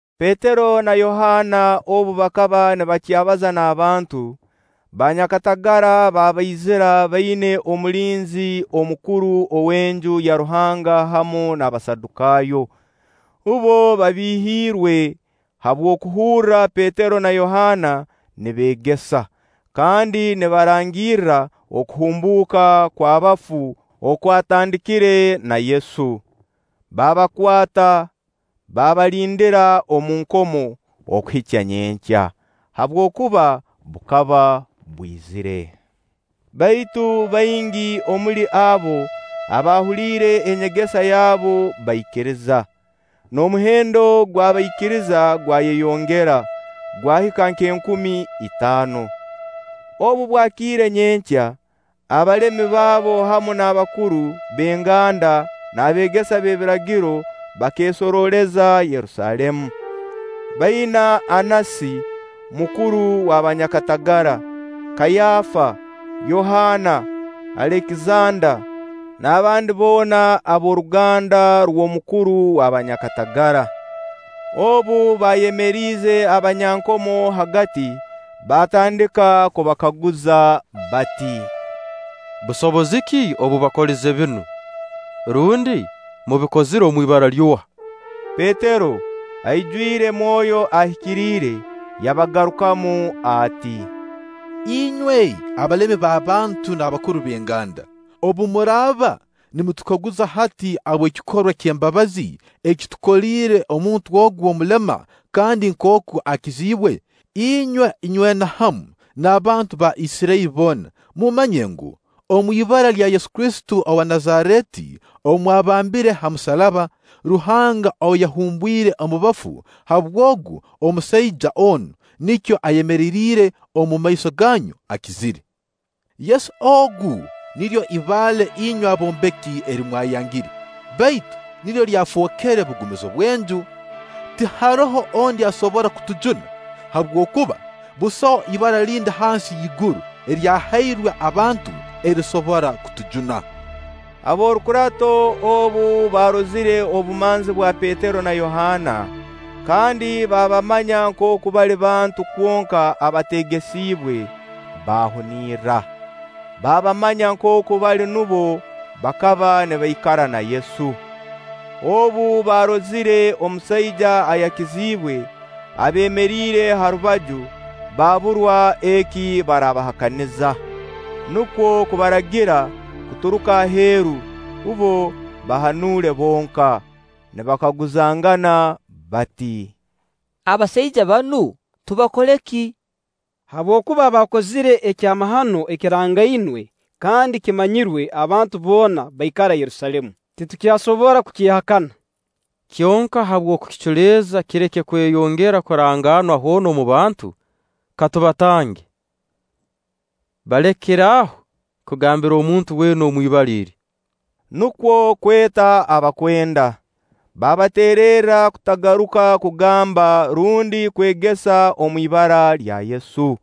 Petero na Yohaana obu bakaba nibakyabaza n'abantu, banyakatagara baabaizira baina omulinzi omukuru w'Enju ya Ruhanga hamu n'Abasadukaayo. Bbo babihiirwe habw'okuhurra Petero na Yohaana nibeegesa kandi nibarangirra okuhumbuuka kw'abafu okwatandikire na Yesu. Baabakwata, baabalindira omu nkomo okuhika nyenkya, habwokuba bukaba bwizire. Baitu baingi omuli abo abaahuliire enyegesa yabu bakaikiriza; n'omuhendo gw'abaikiriza gwayeyongera, gwahika nk'enkumi itaano. Obu bwakiire nyenkya, abalemi baabo hamu n'abakuru b'enganda n'abeegesa b'ebiragiro bakeesorooleza Yerusaalemu, baina Annasi mukuru w' abanyakatagara, Kaayafa, Yohaana, Alekizanda, n'abandi boona ab'oruganda rw'omukuru wa banyakatagara. Obu baayemeriize abanyankomo hagati, baatandika kubakaguza bati: “Busobozi ki obubakoleze binu, rundi mubikozire omu ibara ly'oha?” Petero, aijwire Mwoyo Ahikiriire, yabagarukamu ati: “Inywe abalemi b'abantu n'abakuru b'enganda, obu muraaba nimutukaguza hati habw'ekikorwa ky'embabazi eki tukoliire omuntu ogu omulema kandi nkooku akiziibwe, inywe inywena hamu n'abantu ba Isirairi boona mumanye ngu, omu ibara lya Yesu Kristo owa Nazareeti ou mwabambire hamusaraba, Ruhanga ou yahumbwire omu bafu, habw'Ogu, omusaija onu nikyo ayemereriire omu maiso ganyu akizire. Yesu ogu niryo ibaale inywe abombeki eri mwayangire, baitu niryo lyafookere bugumizo bw'enju. Tiharoho ondi asobora kutujuna, habwokuba busaho ibara lindi hansi y'iguru eryahairwe abantu erisobora kutujuna.” Ab'orukurato obu baarozire obumanzi bwa Petero na Yohaana, kandi baabamanya nkooku bali bantu kwonka abateegesiibwe, baahunirra. Baabamanya nkooku bali nubo abakaba nibaikara na Yesu. Obu baarozire omusaija ayakiziibwe abeemeriire ha rubaju, baaburwa eki baraabahakaniza. Nukwo kubaragira kuturuka aheeru, bbo bahanule bonka, nibakaguzangana bati: “Abasaija banu tubakole ki? Habwokuba baakozire ekyamahano ekirangainwe kandi ekimanyirwe abantu boona abaikara Yerusaalemu, titukyasobora kukyehakana. Kyonka habw'okukiculeeza kireke kweyongera kurangaanwa hoona omu bantu ka tubakange; balekere aho kugambira omuntu weena omu ibara eri.” Nukwo kweta abakwenda, baabateererra kutagaruka kugamba rundi kwegesa omu ibara lya Yesu.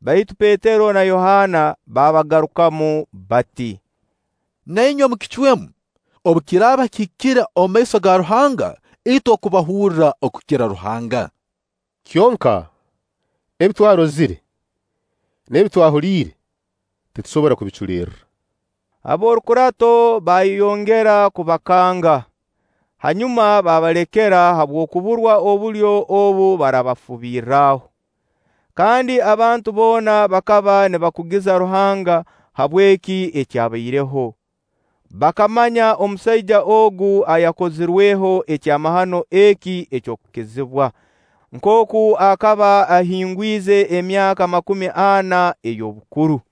Baitu Petero na Yohaana baabagarukamu bati: “Na inywe mukicwemu, obu kiraaba kihikire omu maiso ga Ruhanga itwe okubahurra okukira Ruhanga. Kyonka, ebi twarozire n'ebi twahuliire titusobora kubiculerra.” Ab'orukurato baayongera kubakanga, hanyuma baabalekera, habw'okuburwa obulyo obu baraabafubirraho. Kandi abantu boona bakaba nibakugiza Ruhanga habw'eki ekyabaireho. Bakamanya omusaija ogu ayakozirweho ekyamahano eki eky'okukizibwa, nkooku akaba ahingwize emyaka makumi ana ey'obukuru.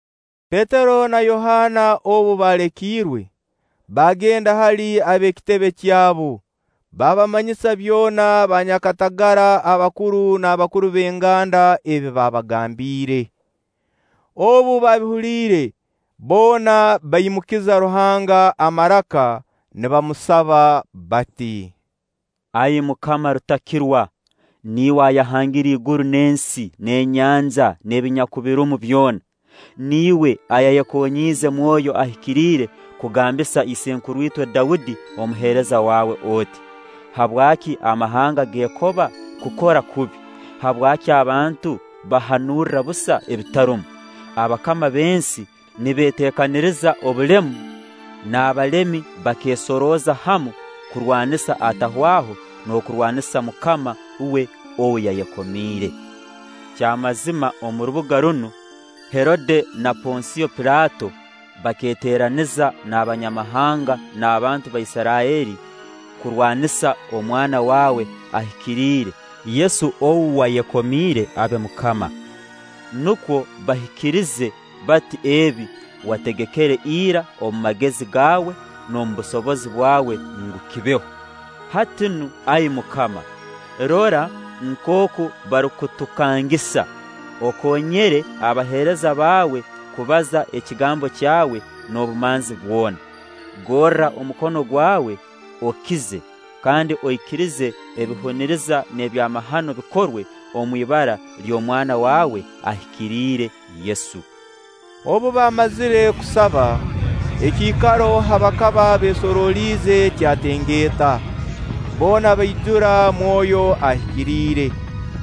Petero na Yohaana obu baalekiirwe, baagenda hali ab'ekitebe kyabu, baabamanyisa byona banyakatagara abakuru n'abakuru b'enganda ebi baabagambiire. Obu baabihuliire, boona baimukiza Ruhanga amaraka nibamusaba bati: “Ai Mukama Rutakirwa, niiwe ayahangire iguru n'ensi, n'enyanja, n'ebinyakubirumu byona, niiwe ayayekonyiize Mwoyo Ahikiriire kugambisa isenkuru-itwe Daudi omuheereza waawe oti: ‘Habwaki amahanga geekoba kukora kubi, habwaki abantu bahanurra busa ebitarumu? Abakama b'ensi nibeetekaniriza obulemu, n'abalemi bakeesorooza hamu kurwanisa Atahwaho n'okurwanisa MUKAMA we ou yayekomiire.’ Kyamazima omu rubuga runu, Herode na Ponsio Pilaato bakeeteeraniza n'Abanyamahanga n'abantu ba Isirairi kurwanisa omwana waawe ahikiriire Yesu ou wayekomiire abe Mukama. Nukwo bahikiriize bati ebi wategekere ira omu magezi gaawe n'omu busobozi bwawe ngu kibeho. Hati nu, Ai MUKAMA, rora nkooku barukutukangisa, okoonyere abaheereza baawe kubaza ekigambo kyawe n'obumanzi bwona. Gorra omukono gwawe, okize; kandi oikirize ebihuniriza n'ebyamahano bikorwe omu ibara ly'omwana waawe ahikiriire Yesu.” Obu baamazire kusaba, ekiikaro ha bakaba beesoroliize kyatengeeta; boona baijura Mwoyo Ahikiriire,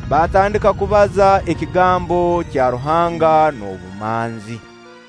baatandika kubaza ekigambo kya Ruhanga n'obumanzi.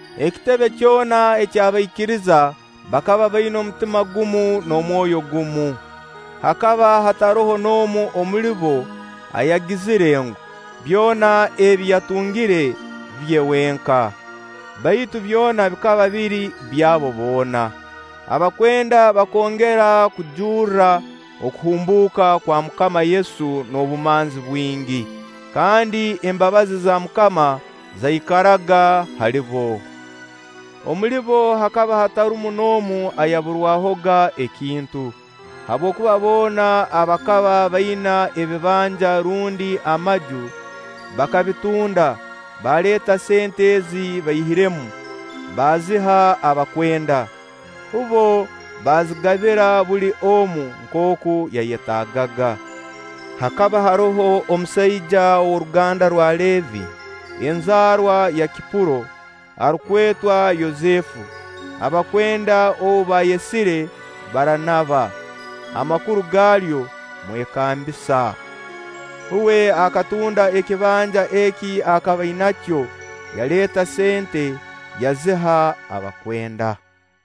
Ekitebe kyona eky'abaikiriza bakaba baina omutima gumu n'omwoyo gumu. Hakaba hataroho n'omu omuli bo ayagizire ngu, byona ebi yatungire bye wenka; baitu byona bikaba biri by'abo boona. Abakwenda bakongera kujurra okuhumbuuka kwa MUKAMA Yesu n'obumanzi bwingi, kandi embabazi za MUKAMA zaikaraga hali bo. Omuli bo hakaba hatarumu n'omu ayaburwahoga ekintu, habwokuba boona abakaba baina ebibanja rundi amaju bakabitunda, baaleeta sente ezi baihiremu, baaziha abakwenda. Bbo baazigabira buli omu nkooku yayetaagaga. Hakaba haroho omusaija ow'oruganda rwa Leevi, enzaarwa ya Kipuro, arukwetwa Yosefu, abakwenda ou baayesire Baranaba (amakuru gaalyo: Mwekambisa). Uwe akatunda ekibanja eki akaba ainakyo, yaleeta sente, yaziha abakwenda.